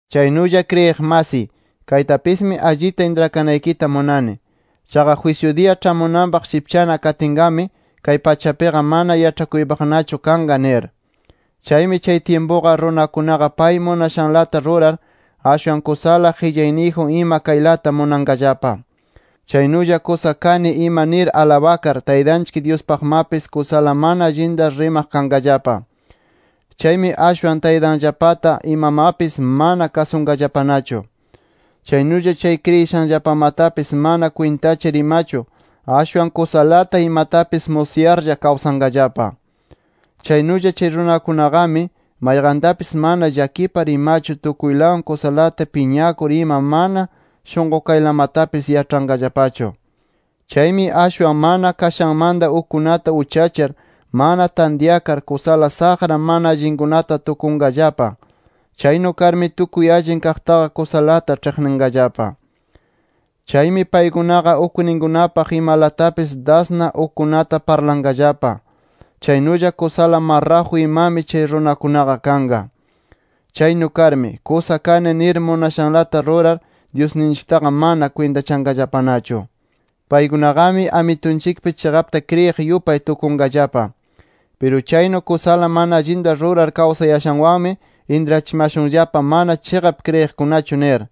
Chaynulla kriyiq masiy, kaytapismi allita intrakanaykita munani. Chaqa jwisyu diya ĉhamunanpaq shipchana katinqami, kay pachapiqa mana yaĉhakuypaqnachu kanqa nir. Chaymi chay tyimpuqa runakunaqa pay munashanlata rurar, ashwan kusala qillayniyjun ima kaylata munanqallapa. Chaynulla kusa kani ima nir alabakar, Taytanchik Dyuspaqmapis kusala mana allinta rimaq kanqallapa. Chaymi ashwan taytanllapata imamapis mana kasunqallapanachu. Chaynulla chay kriyishanllapamatapis mana kwintachar imachu, ashwan kusalata imatapis musyarlla kawsanqallapa. Chaynulla chay runakunaqami, mayqantapis mana llakipar imachu tukuylawan kusalata piñakur ima mana shunqukaylamatapis yaĉhanqallapachu. Chaymi ashwan mana kashanmanta ukkunata uchachar, mana tantyakar, kusala saqra mana allinkunata tukunqallapa. Chaynu karmi tukuy allin kaqtaqa kusalata ĉhiqninqallapa. Chaymi paykunaqa ukninkunapaq imalatapis dasna ukkunata parlanqallapa. Chaynulla kusala marraju imami chay runakunaqa kanqa. Chaynu karmi, kusa kani nir munashanlata rurar, Dyusninchiktaqa mana kwintachanqallapanachu. Paykunaqami Amitunchikpi chiqapta kriyiq yupay tukunqallapa. Piru chaynu kusala mana allinta rurar kawsayashanwanmi intrachimashunllapa mana chiqap kriyiqkunachu nir.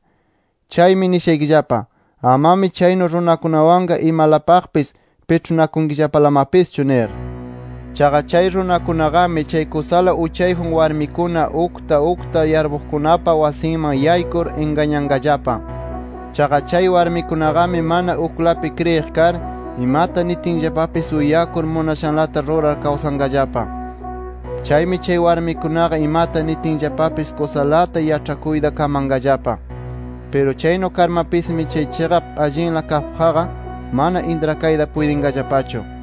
Chaymi nishaykillapa: Amami chaynu runakunawanqa imalapaqpis piĉhunakunkillapalamapischu nir. Chaqa chay runakunaqami chay kusala uchayjun warmikuna ukta ukta yarpuqkunapa wasinman yaykur ingañanqallapa. Chaqa chay warmikunaqami mana uklapi kriyiq kar, imata nitinllapapis uyakur munashanlata rurar kawsanqallapa. Chaymi chay warmikunaqa imata nitinllapapis kusalata yaĉhakuyta kamanqallapa. Piru chaynu karmapismi chay chiqap allinla kaqpaqqa mana intrakayta puytinqallapachu.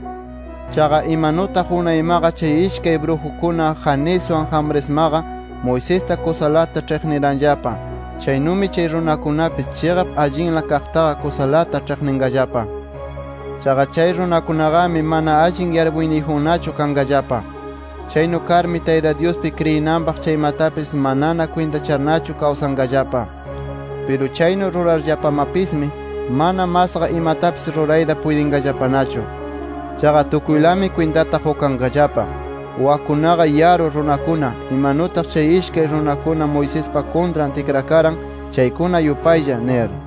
Chaqa imanutaq unaymaqa chay ishkay brujukuna Janeswan Jambresmaqa, Moisesta kusalata ĉhiqniranllapa, chaynumi chay runakunapis, chiqap allinla kaqtaqa kusalata ĉhiqninqallapa. Chaqa chay runakunaqami mana allin yarpuyniyjunnachu kanqallapa. Chaynu karmi Tayta Dyuspi kriyinanpaq chaymatapis manana kwintacharnachu kawsanqallapa. Piru chaynu rurarllapamapismi, mana masqa imatapis rurayta puytinqallapanachu. Chaqa tukuylami kwintata qukanqallapa, wakkunaqa yaru runakuna, imanutaq chay ishkay runakuna Moisespa kuntran tikrakaran chaykuna yupaylla nir.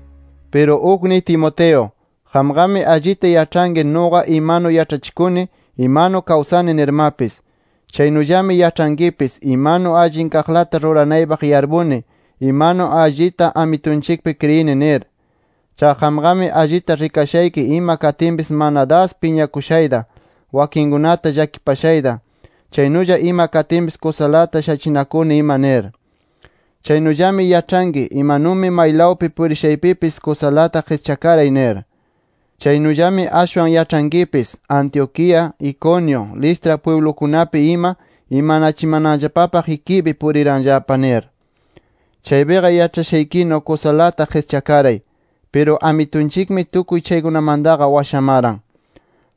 Piru ukniy Timoteo, qamqami allita yaĉhanki nuqa imanu yaĉhachikuni, imanu kawsani nirmapis. Chaynullami yaĉhankipis imanu allin kaqlata ruranaypaq yarpuni, imanu allita Amitunchikpi kriyini nir. Chaqa qamqami allita rikashayki ima katinpis mana das piñakushayta, wakinkunata llakipashayta, chaynulla ima katinpis kusalata shachinakuni ima nir. Chaynullami yaĉhanki imanumi maylawpi purishaypipis kusalata qischakaray nir. Chaynullami ashwan yaĉhankipis Antioquía, Iconio, Listra pwiblukunapi ima imanachimananllapapaq ikiypi puriranllapa nir. Chaypiqa yaĉhashaykinu kusalata qischakaray. Piru Amitunchikmi tukuy chaykunamantaqa washamaran.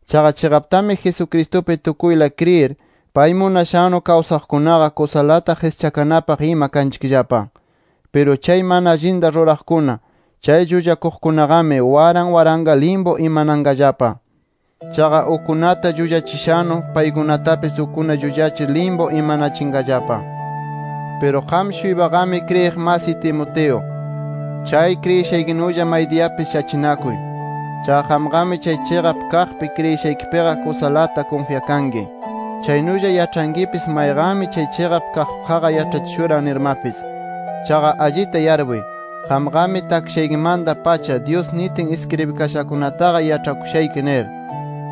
Chaqa chiqaptami Jesucristupi tukuyla kriyir, pay munashannu kawsaqkunaqa, kusalata qischakanapaq ima kanchikllapa. Piru chay mana allinta ruraqkuna, chay llullakuqkunaqami, waran waranqa limpu imananqallapa. Chaqa ukkunata llullachishannu, paykunatapis ukkuna llullachir limpu imanachinqallapa. Piru qam-shuypaqami kriyiq masiy Timoteo, chay kriyishaykinulla maydiyapis shachinakuy. Chaqa qamqami chay chiqap kaqpi kriyishaykipiqa kusalata kunfyakanki. Chaynulla yaĉhankipis mayqanmi chay chiqap kaqpaqqa yaĉhachishuran nirmapis. Chaqa allita yarpuy, qamqami takshaykimanta-pacha Dyus nitin iskribikashakunataqa yaĉhakushayki nir.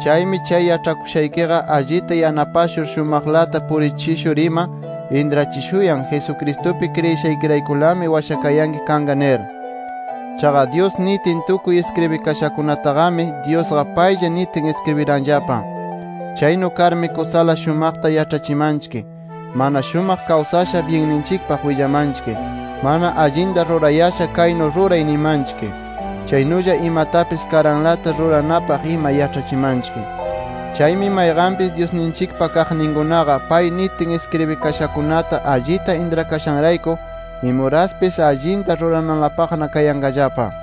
Chaymi chay yaĉhakushaykiqa, allita yanapashur shumaqlata purichishur ima, intrachishuyan Jesucristupi kriyishaykiraykulami washakayanki kanqa nir. Chaqa Dyus nitin tukuy iskribikashankunataqami Dyusqa paylla nitin iskribiranllapa. Chaynu karmi kusala shumaqta yaĉhachimanchik, mana shumaq kawsasha byinninchikpaq willamanchik, mana allinta rurayasha kaynu ruray nimanchik. Chaynulla imatapis karanlata ruranapaq ima yaĉhachimanchik. Chaymi mayqanpis Dyusninchikpa kaqninkunaqa pay nitin iskribikashakunata allita intrakashanrayku imuraspis allinta rurananlapaqna kayanqallapa.